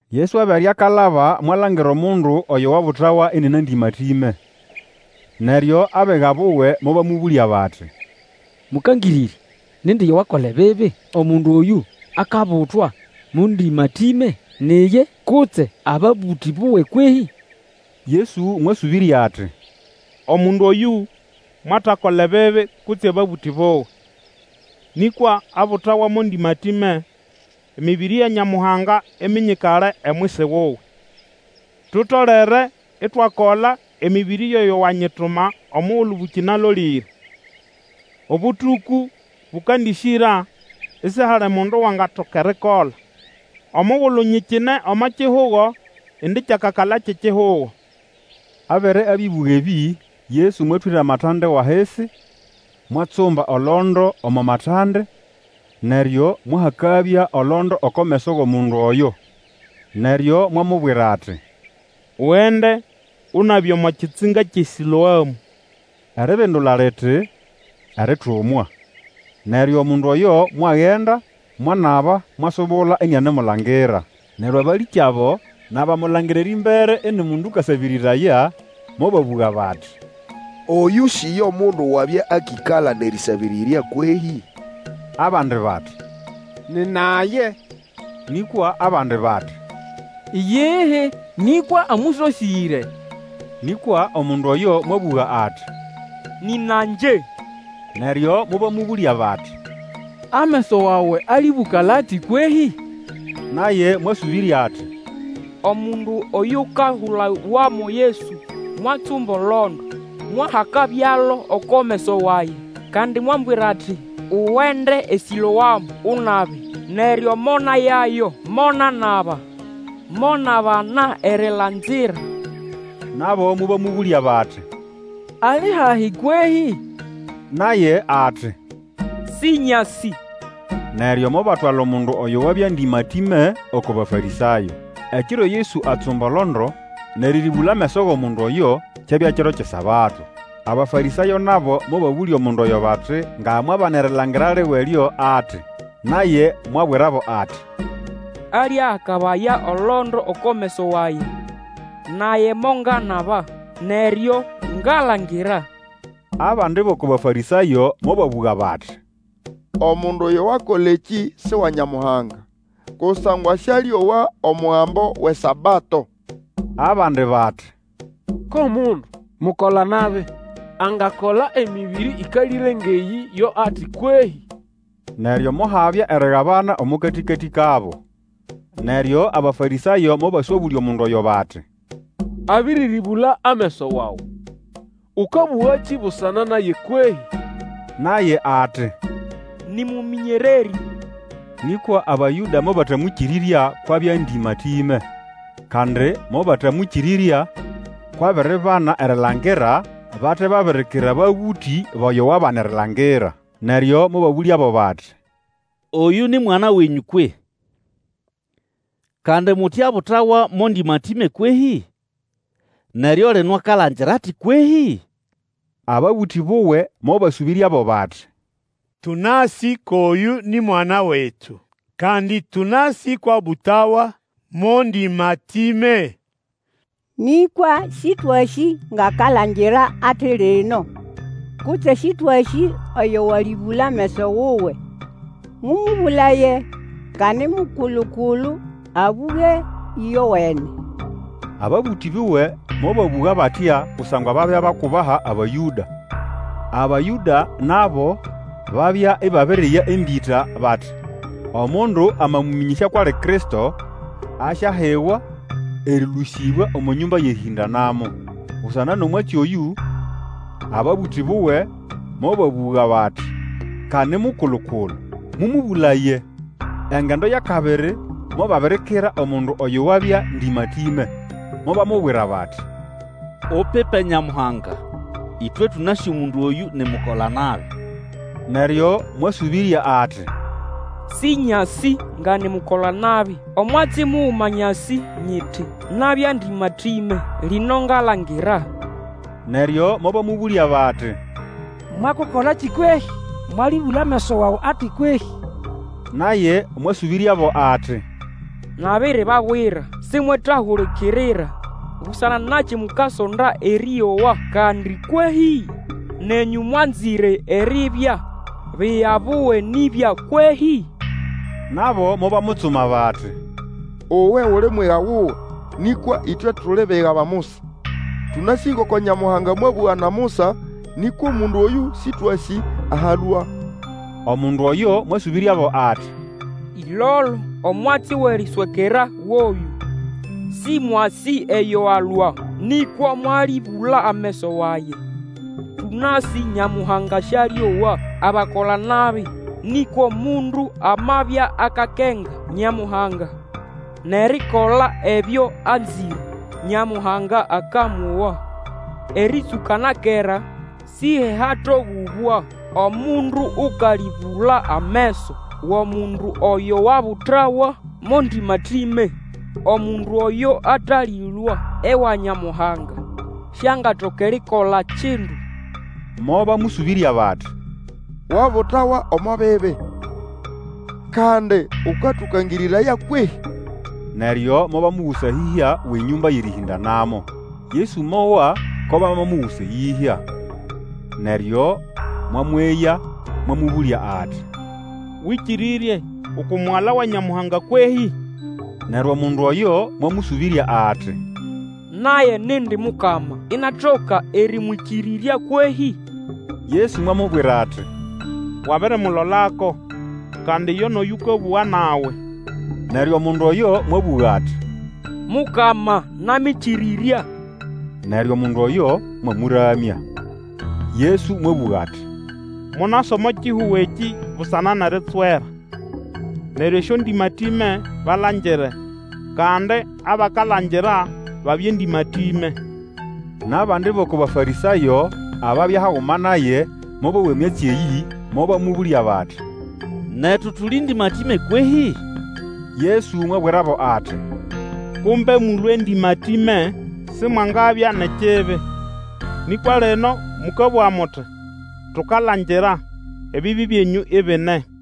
Yesu abere akalaba mwalangira omundu oyo wabutawa inina ndĩmatĩme. Neryo abiga buwe mobamũbũlya bati, Mũkangĩrĩrya, nindi yo wakola ebibi, omundu oyũ akabutwa mo ndĩmatĩme, ni iye, kutse ababũtĩ buwe kwehĩ? Yesu mwasũbĩrya ati, Omundu oyũ mwatakola ebibi kutse ababũtĩ buwe, nĩkwa abutawa mo ndĩmatĩme, emĩbĩrĩ ya Nyamuhanga iminyikale omwisi wuwe. Tutolere itwakola emĩbĩrĩ yʼoyo wanyituma omugulu bũkĩnalolĩre; obũtũkũ bũkandĩsyĩra, isihali mundu wangatoka erikola. Omugulu nyikine omo kihugo indi kyakakala kyʼekihugo. Abere abĩbũga ebĩ, Yesu mwatwĩra amatande wʼahisi, mwatsumba olondo omo matande; neryo mwahakabya olondo oko meso wʼomundu oyo. Neryo mwamubwira ati, Ugende, unabe omo kitsinga kyʼeSĩloamũ, eribindula liti, Eritumwa. Neryo omundu oyo mwagenda, mwanaba, mwasubula inianemulangira. Neryo abalĩkyabo, nʼabamulangira erĩmbere ini mundu ũkasabĩrĩraya, mobabũga bati, Oyũ si yo mundu wabya akĩkala nʼerĩsabĩrĩrya kwehĩ? Abandi bati, Nina ye, nĩkwa abandi bati, Iyihi, nĩkwa amũsosĩre. Nĩkwa omundu oyo mwabũga ati, Nĩna ngye. Neryo mobamũbũlya bati, Ameso wawe alĩbũkala ati kwehĩ? Naye mwasũbĩrya ati, Omundu oyukahulawa mo Yesu mwatsumba olondo, mwahakabyalo oko meso wage, kandi mwambwira ati, Ugende eSĩloamũ, unabe. Neryo monayayo monanaba, monabana erilangira. Nabo mobamũbũlya bati, Ali hahi kwehĩ? Naye ati, Sĩnyasĩ. Neryo mobatwala omundu oyo wabya ndĩmatĩme oko Bafarĩsayo. Ekiro Yesu atsumba olondo, nʼerĩrĩbũla ameso wʼomundu oyo, kyabya kiro kyʼeSabato. Abafarĩsayo nabo mobabũlya omundu oyo bati nga mwabana erilangira liwe lyo ati. Naye mwabwirabo ati, Aliahakabaya olondo oko meso wage, nage monganaba, neryo ngalangira. Abandi bʼoko Bafarĩsayo mobabũga bati, Omundu oyo wakola ekĩ si wa Nyamuhanga, kusangwa sĩalĩowa omugambo wʼeSabato. Abandi bati, Ko mundu mukola-nabi angakola emĩbĩrĩ ĩkalĩre ngʼeyĩ yo ati kwehĩ? Neryo mohabya erigabana omo katĩkatĩ kabo. Neryo Abafarĩsayo mobaswabũlya omundu oyo bati, Abĩrĩrĩbũla ameso wawe, ũkabũgakĩ busana naye kwehĩ? Naye ati, Nĩ mũmĩnyererĩ. Nĩkwa Abayũda mobatamwĩkĩrĩrya kwʼabya ndĩmatĩme, kandi mobatamwĩkĩrĩrya kwʼabiribana erilangira bate babirikira ababũtĩ bʼoyo wabana erilangira. Neryo mobabũlyabo bati, Oyũ ni mwana wenyũ kwehĩ? Kandi muti abutawa mo ndĩmatĩme kwehĩ? Neryo lino akalangira ati kwehĩ? Ababũtĩ buwe mobasũbĩryabo bati, Tũnasĩ kwʼoyũ ni mwana wetu, kandi tũnasĩ kwʼabutawa mo ndĩmatĩme. Nĩkwa Sĩtwasĩ ngʼakalangira ati lino, kutse Sĩtwasĩ oyo walĩbũla ameso wuwe. Mũmũbũlaye, ka ni mukulu-kulu, abũge ĩyowene. Ababũtĩ buwe mobabũga batya kusangwa babya bakubaha Abayũda. Abayũda nabo babya ibabiriya embĩta bati omundu amamũmĩnyĩsya kwʼali Kristo, asyahiwa erĩlũsĩbwa omo nyũmba yʼerĩhĩndanamo. Busana nʼomwatsi oyũ, ababũtĩ buwe mobabũga bati, Ka ni mukulu-kulu, mũmũbũlaye! Engendo yʼakabiri mobabirikira omundu oyo wabya ndĩmatĩme, mobamubwira bati, Upipe Nyamuhanga; ĩtwe tũnasĩ omundu oyũ ni mukola-nabi. Neryo mwasũbĩrya ati, Sĩnyasĩ nga ni mukola-nabi; omwatsi muguma nyasĩ nyiti, nabya ndĩmatĩme, lino ngalangira. Neryo mobamũbũlya bati, Mwakukolakĩ kwehĩ? Mwalĩbũla ameso wawe ati kwehĩ? Naye mwasũbĩryabo ati, Nabiribabwira, simwetahulikirira. Busana nakĩ mukasonda erĩowa kandi kwehĩ? Nenyũ mwanzĩre eribya biga buwe nibya kwehĩ? Nabo mobamutsuma, bati, Uwe uli mwiga wuwe, nĩkwa ĩtwe tuli biga ba Musa. Tũnasĩ ngoko Nyamuhanga mwabũga na Musa; nĩkwa omundu oyũ Sĩtwasĩ aho alũa. Omundu oyo mwasũbĩryabo ati, Ĩlolo, omwatsi wʼeriswekera goyũ, sĩmwasĩ eyo alũa, nĩkwa mwalĩbũla ameso wage! Tũnasĩ Nyamuhanga sĩalĩowa abakola-nabi; nĩkwa omundu amabya akakenga Nyamuhanga, nʼerikola ebyo anzĩre, Nyamuhanga akamowa. Erĩtsũka na kera sihehatogũbwa omundu ũkalĩbũla ameso wʼomundu oyo wabutawa mo ndĩmatĩme. Omundu oyo atalĩlũa ewa Nyamuhanga, siangatoka erikola kindu. Mobamũsũbĩrya bati, Wabutawa omo bibi, kandi ũkatũkangĩrĩraya kwehĩ? Neryo mobamugusa eyĩhya wʼenyũmba yʼerĩhĩndanamo. Yesu mowa ko bamamugusa eyĩhya. Neryo mwamweya, mwamũbũlya ati, Wĩkĩrĩrye uku Mugala wa Nyamuhanga kwehĩ? Neryo omundu oyo mwamũsũbĩrya ati, Naye nindi Mukama, inatoka erĩmwĩkĩrĩrya kwehĩ? Yesu mwamubwira ati, Wabirimulolako, kandi yo nʼoyũkabũga nawe. Neryo omundu oyo mwabũga ati, Mukama, namĩkĩrĩrya! Neryo omundu oyo mwamũramya. Yesu mwabũga ati, Monasa omo kihugo ekĩ busana nʼeritswera, neryo esyondĩmatĩme balangire, kandi abakalangira babye ndĩmatĩme. Nʼabandi bʼoko Bafarĩsayo ababya haguma naye mobowa emyatsi eyĩ, mobamũbũlya bati, Netu tuli ndĩmatĩme kwehĩ? Yesu mwabwirabo ati, Kumbe mũlũe ndĩmatĩme simwangabya nʼekibi; nĩkwa lino mũkabũga muti, Tukalangira; ebibi byenyũ ibine.